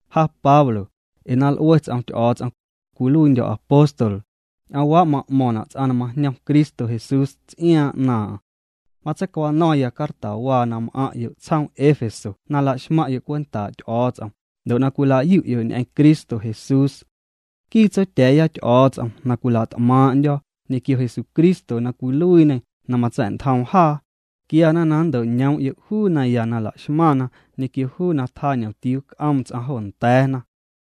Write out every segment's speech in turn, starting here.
Ja Pablo, ee na l'ue ts'om Ty'o̱o̱ts'om, cwiluiindyo̱ apóstol, ñ'oomwaa' ma'mo̱ⁿna' ts'aⁿ na majñom Cristo Jesús ts'iaaⁿ 'naaⁿ'aⁿ. Matseicwano̱ⁿya cartawaa na m'aⁿ'yo' tsjoom Éfeso na la'xmaⁿ'yo' cwentaa' Ty'o̱o̱ts'om ndo' na cwila'yu'yo' ñ'eⁿ Cristo Jesús. Nquii Tsotya̱a̱ya Ty'o̱o̱ts'om na cwila't'maaⁿ'ndyo̱ ñequio Jesucristo na cwiluiiñê na matsa̱'ntjoom jaa, quiana na nnto'ñoom'yo' juu naya na laxmaⁿna ñequio juu na tjañomtiuu c'oom ts'aⁿ jo nda̱a̱na.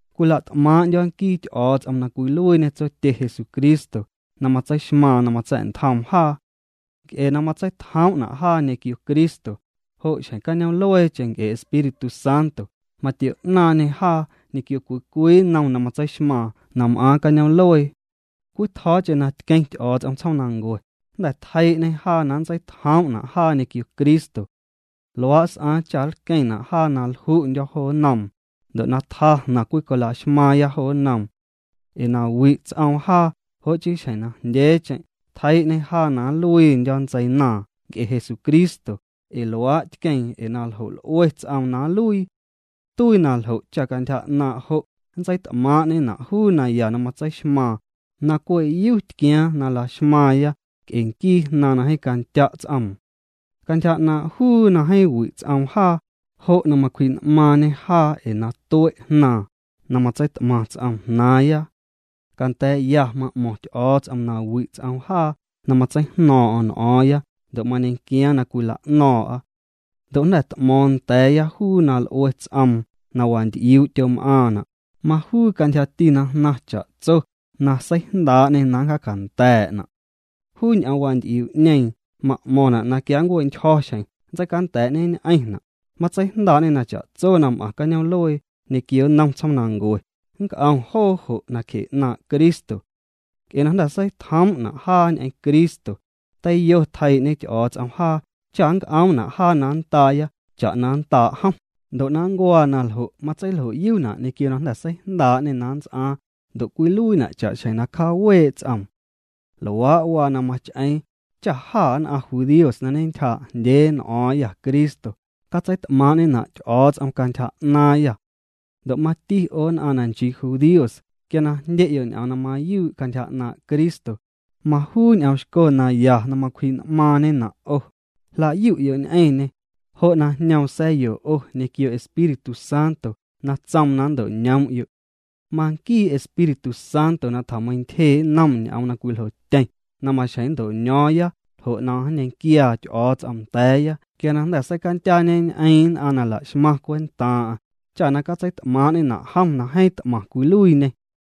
Cwila't'maaⁿ'ndyo̱ nquii Ty'o̱o̱ts'om na cwiluiiñê tsotye Jesucristo na matseixmaaⁿ na matsa̱'ntjoom jaa. Nc'e na matseitjoom'na' jaa ñequio Cristo, jo' xjeⁿ cañoom'lueecheⁿ nc'e Espíritu Santo matio'naaⁿñê jaa ñequio cwii cwii nnom na matseixmaaⁿ na m'aaⁿ cañoom'luee. Cwitjo̱o̱cheⁿ na tqueⁿ Ty'o̱o̱ts'om tsjoomnancue, jnda̱ tjeii'ñê jaa na nntseitjoom'na' jaa ñequio Cristo. Luaa' s'aaⁿ cha nlqueⁿna' jaa na lju'ndyo̱ jo nnoom, ndo' na tjaa jnaⁿ cwicolaxmaaⁿya jo nnoom. Ee na wi' ts'oom jaa jo' chii xjeⁿ na jndyeecheⁿ tjeii'ñê jaa na nluiindyo̱ ntseinaaⁿ nc'e Jesucristo, ee luaa' tqueeⁿ ee na ljo' l'ue ts'oom na nluii. Tuii na ljo' cha' cantyja 'naaⁿ' jo' nntseit'maaⁿ'ñena' juu naya na matseixmaaⁿ, na cwe' yu tquiaaⁿ na la'xmaaⁿya nc'e nquii Jnaaⁿ na jeeⁿ candya' ts'oom. Cantyja 'naaⁿ' juu na jeeⁿ wi' ts'oom jaa, jo' na macwji'n'maaⁿñê jaa ee na tue' Jnaaⁿ, na matseit'maⁿ ts'oom jnaaⁿya. Canda̱a̱'ya ma'mo̱ⁿ Ty'o̱o̱ts'om na wi' ts'oom jaa na matseijno̱o̱ⁿ'o̱ⁿ n'o̱o̱ⁿya ndo' mañequiaaⁿ na cwila'no̱o̱ⁿ'a. Ndo' jnda̱ t'mo̱o̱ⁿ nda̱a̱ya juu na l'ue ts'oom na wanty'iuu' tyom'aaⁿna', majuu cantyjati na jnaⁿ cha'tso na seijndaa'ñê na nncjaacanda̱a̱'na'. Juu ñ'oom wanty'iuu'ñeeⁿ ma'mo̱ⁿna' na quia nncue'ntyjo̱ xjeⁿ nntseicanda̱a̱'ñeñ'eⁿna', matseijndaa'ñê na cha'tso na m'aⁿ cañoom'luee ñequio nnom tsjoomnancue nc'om joo jo' nacje 'naaⁿ' Cristo. Nc'e na jnda̱ seitjoom'na' jaa ñ'eⁿ Cristo, teiyo tjeii'ñe Ty'o̱o̱ts'om jaa cha na nc'oomna' jaa na nndaaya cha'na na nndaa' jom, ndo' na nncuaa na ljo' matseiljo'yuna' ñequio na jnda̱ seijndaa'ñê na nnts'aaⁿ ndo' cwiluiina' cha'xjeⁿ na cjaawee' ts'oom. Luaa' waa na mach'eeⁿ cha jâ nn'aⁿ judíos na ñentyjaa'jndyee n'o̱o̱ⁿya Cristo, catseit'maaⁿ'ñena' Ty'o̱o̱ts'om cantyja 'naaⁿyâ. Ndo' mati 'o nn'aⁿ na nchii judíos quia na jndye'yo' ñ'oom na mayuu' cantyja 'naaⁿ' Cristo, majuu ñ'oomxco naya na macwji'n'maaⁿñena' 'o, jla'yu'yo' ñ'eⁿñê, jo' na jñoom sa̱yo 'o ñequio Espíritu Santo na tsoom na nnto'ñoom'yo'. Manquii Espíritu Santo na tjameiⁿntyjee' nnom ñ'oom na cwiljotyeⁿ na maxjeⁿ nnto'ño̱o̱ⁿya ljo' na nñequiaa Ty'o̱o̱ts'om nda̱a̱ya quia na jnda̱ seicandyaañeñ'eeⁿ nn'aⁿ na nla'xmaⁿ cwentaaⁿ'aⁿ, cha na catseit'maaⁿ'ñena' jom na jeeⁿ t'maⁿ cwiluiiñê.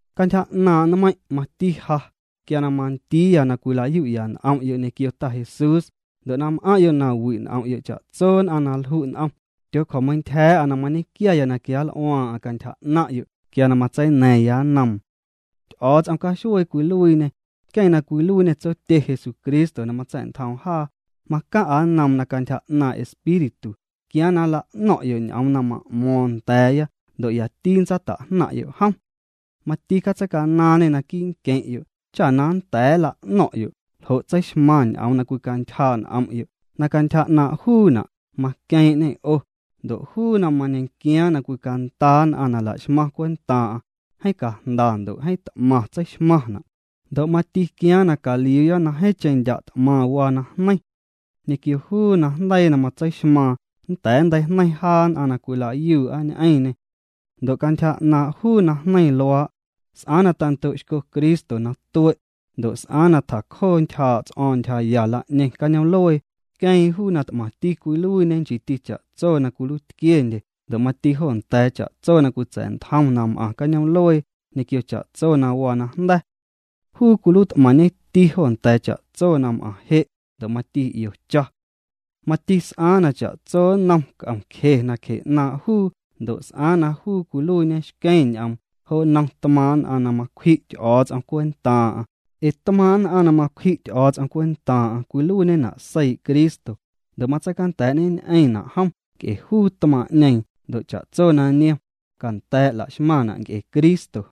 Cantyja 'naaⁿ' nmeiⁿ' mati ja quia na mandiiya na cwila'yu'ya n'om'yo' ñequio Ta Jesús ndo' na m'aⁿ'yo' na wi' n'om'yo' cha'tso nn'aⁿ na lju' n'om, tyoocjo̱meiⁿntyja̱a̱'a na mañequiaya na quianl'uaaⁿ'aⁿ cantyja 'naⁿ'yo' quia na matseina̱ⁿya nnoom. Ty'o̱o̱ts'om caxuee cwiluiiñê, nqueⁿ na cwiluiiñê Tsotye Jesucristo na matsa̱'ntjoom jaa, macaⁿ'a nnoom na cantyja 'naaⁿ' Espíritu quiaaⁿ na nla'no̱ⁿ'yo' ñ'oom na ma'mo̱o̱ⁿ nda̱a̱ya ndo' yati ntsata'jnaⁿ'yo' jom. Mati catseicanaaⁿñê naquii' nqueⁿ'yo' cha na nnda̱a̱ nla'no̱ⁿ'yo' ljo' tseixmaⁿ ñ'oom na cwicantyjaa' n'om'yo' na cantyja 'naaⁿ' juuna' maqueeⁿ'ñê 'o, ndo' juu na mañequiaaⁿ na cwicandaa nn'aⁿ na laxmaⁿ cwentaaⁿ'aⁿ, jeeⁿ cajndana' ndo' jeeⁿ t'maⁿ tseixmaⁿna', ndo' mati quiaaⁿ na caliuuya na jeeⁿcheⁿ ndya' t'maⁿ waa na jneiⁿ. Ñequio juu najndeii na matseixmaaⁿ nnda̱a̱ nnteijneiⁿ jaa nn'aⁿ na cwila'yuu'a ñ'eⁿñê. Ndo' cantyja 'naaⁿ' juu najneiⁿ luaa', s'aaⁿ na tando'xco Cristo na tue', ndo' s'aaⁿ na tjacjoo ntyjaa' ts'o̱o̱ⁿ ntyjaya la'ñeⁿ cañoom'luee, tqueeⁿ juu na t'maⁿti cwiluiiñe nchiiti cha'tso na cwiluiitquiendye ndo' mati jo nda̱a̱ cha'tso na cwitsa̱'ntjom na m'aⁿ cañoom'luee ñequio cha'tso na waa najnda̱. Juu cwiluiit'maⁿñeti jo nda̱a̱ cha'tso na m'aⁿ je' ndo' mati 'io cha. Mati s'aaⁿ na cha'tso nnom c'om nacje 'naaⁿ' juu ndo' s'aaⁿ na juu cwiluiiñe xqueⁿ ñ'oom jo nnom tmaaⁿ' nn'aⁿ na macwji' Ty'o̱o̱ts'om cwentaaⁿ'aⁿ, ee tmaaⁿ' nn'aⁿ na macwji' Ty'o̱o̱ts'om cwentaaⁿ'aⁿ cwiluiiñena' seii' Cristo ndo' matseicanda̱a̱'ñeñ'eⁿna' jom nc'e juu tmaaⁿ'ñeeⁿ ndo' cha'tso na niom, canda̱a̱' laxmaⁿna' nc'e Cristo.